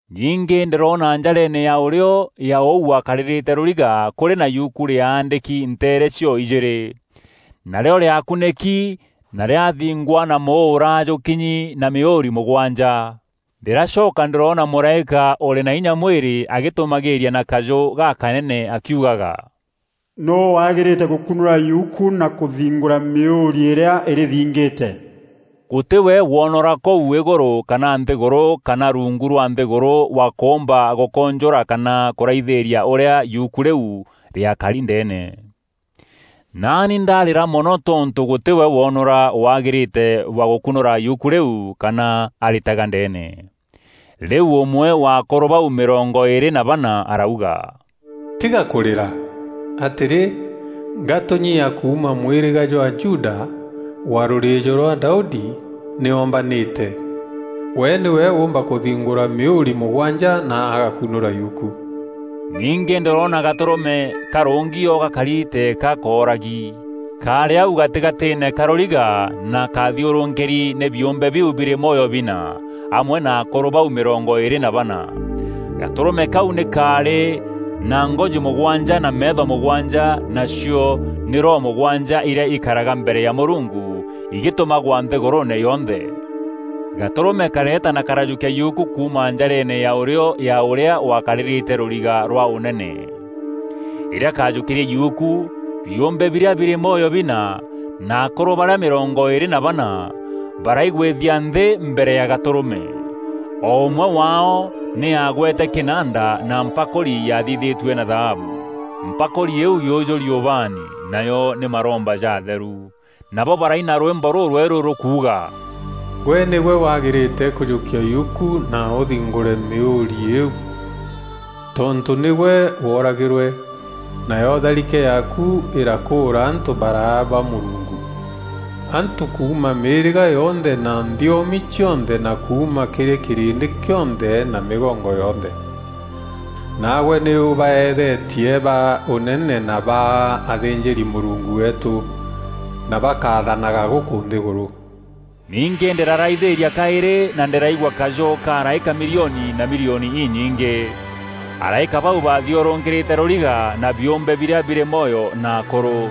Ningî ndîroona njareene ya ûrîo ya ûu wakarîrîte rûriga kûrî na yuku rîaandîki nteere cio-ijîîrî. Narîo rîakunîki na rîathingwa na mûûra jûkinyi na mîûûri mûgwanja. Ndîracoka ndîroona mûraîka ûrî na inya mwîrî agîtûmagîîria na kajû gakanene akiugaga, “Nûû wagîrîte gûkunûra yuku na kûthingûra mîûûri îrîa îrîthingîte?” Gûtî we woonora kûu îgûrû kana nthîgûrû kana rungu rwa nthîgûrû wa kûûmba gûkûnjûra kana kûraithîîria ûrîa yuku rîu rîakari ndeene. Naani ndîrarîra mono tontû gûtî we woonora wagîrîte wa gûkunûra yuku rîu kana arîtega ndeene. Rîu ûmwe wa akûrû bau mîrongo îîrî na bana arauga, “Tiga kûrîra! Atîrî, Ngatûnyi ya kuuma mwîrîga jwa Juda, wa rûrîîjo rwa Daudi, nî ombanîte. We nîwe oomba kûthingûra mîûûri mûgwanja na agakunûra yuku.” Ningî ndîroona Gatûrûme karûngi o gakari teeka kooragi. Kaarî au gatîgatîîne ka rûriga na kathiûrûkîri nî biûmbe biu birî mwoyo bina, amwe na akûrû bau mîrongo îîrî na bana. Gatûrûme kau nî kaarî na ngoji mûgwanja na meetho mûgwanja nacio nî roho mûgwanja irîa ikaraga mbere ya Mûrungu igîtûmagwa nthîgûrûûne yonthe. Gatûrûme kareeta na karajûkia yuku kuuma njareene ya ûrîo ya ûrîa wakarîrîte rûriga rwa ûnene. Rîrîa kaajûkîrie yuku, biûmbe birîa birî mwoyo bina na akûrû barîa mîrongo îîrî na bana baraigwîthia nthî mbere ya Gatûrûme. O ûmwe waao nî aagwete kînanda na mpakûri yathithîtue na thaabu. Mpakûri îîu yûjûri ubaani, nayo nî maromba ja atheru. Nabo baraina rwîmbo rûrwerû rûkuuga, “Gwe nîgwe wagîrîte kûjûkia yuku na ûthingûre mîûûri îîu, tontû nîgwe wooragîrwe, nayo tharike yaaku îrakûûra antû baraa ba Mûrungu. Antû kuuma mîîrîga yonthe na nthiomi cionthe, na kuuma kîrî kîrîndî kîonthe na mîgongo yonthe. Naagwe nî ûbaeethetie ba ûnene na baa athînjîri-Mûrungu weetû, na bakathanaga gûkû nthîgûrû.” Ningî ndîraraithîîria kaîrî na ndîraigua kajû ka araîka milioni na milioni inyingî. Araîka bau bathiûrûkîrîte rûriga na biûmbe birîa birî mwoyo na akûrû.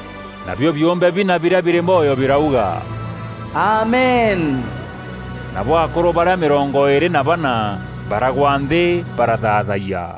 Nabio biûmbe bina birîa birî mwoyo birauga, “Amen!” Nabo akûrû barîa mîrongo îîrî na bana baragwa nthî barathaathayia.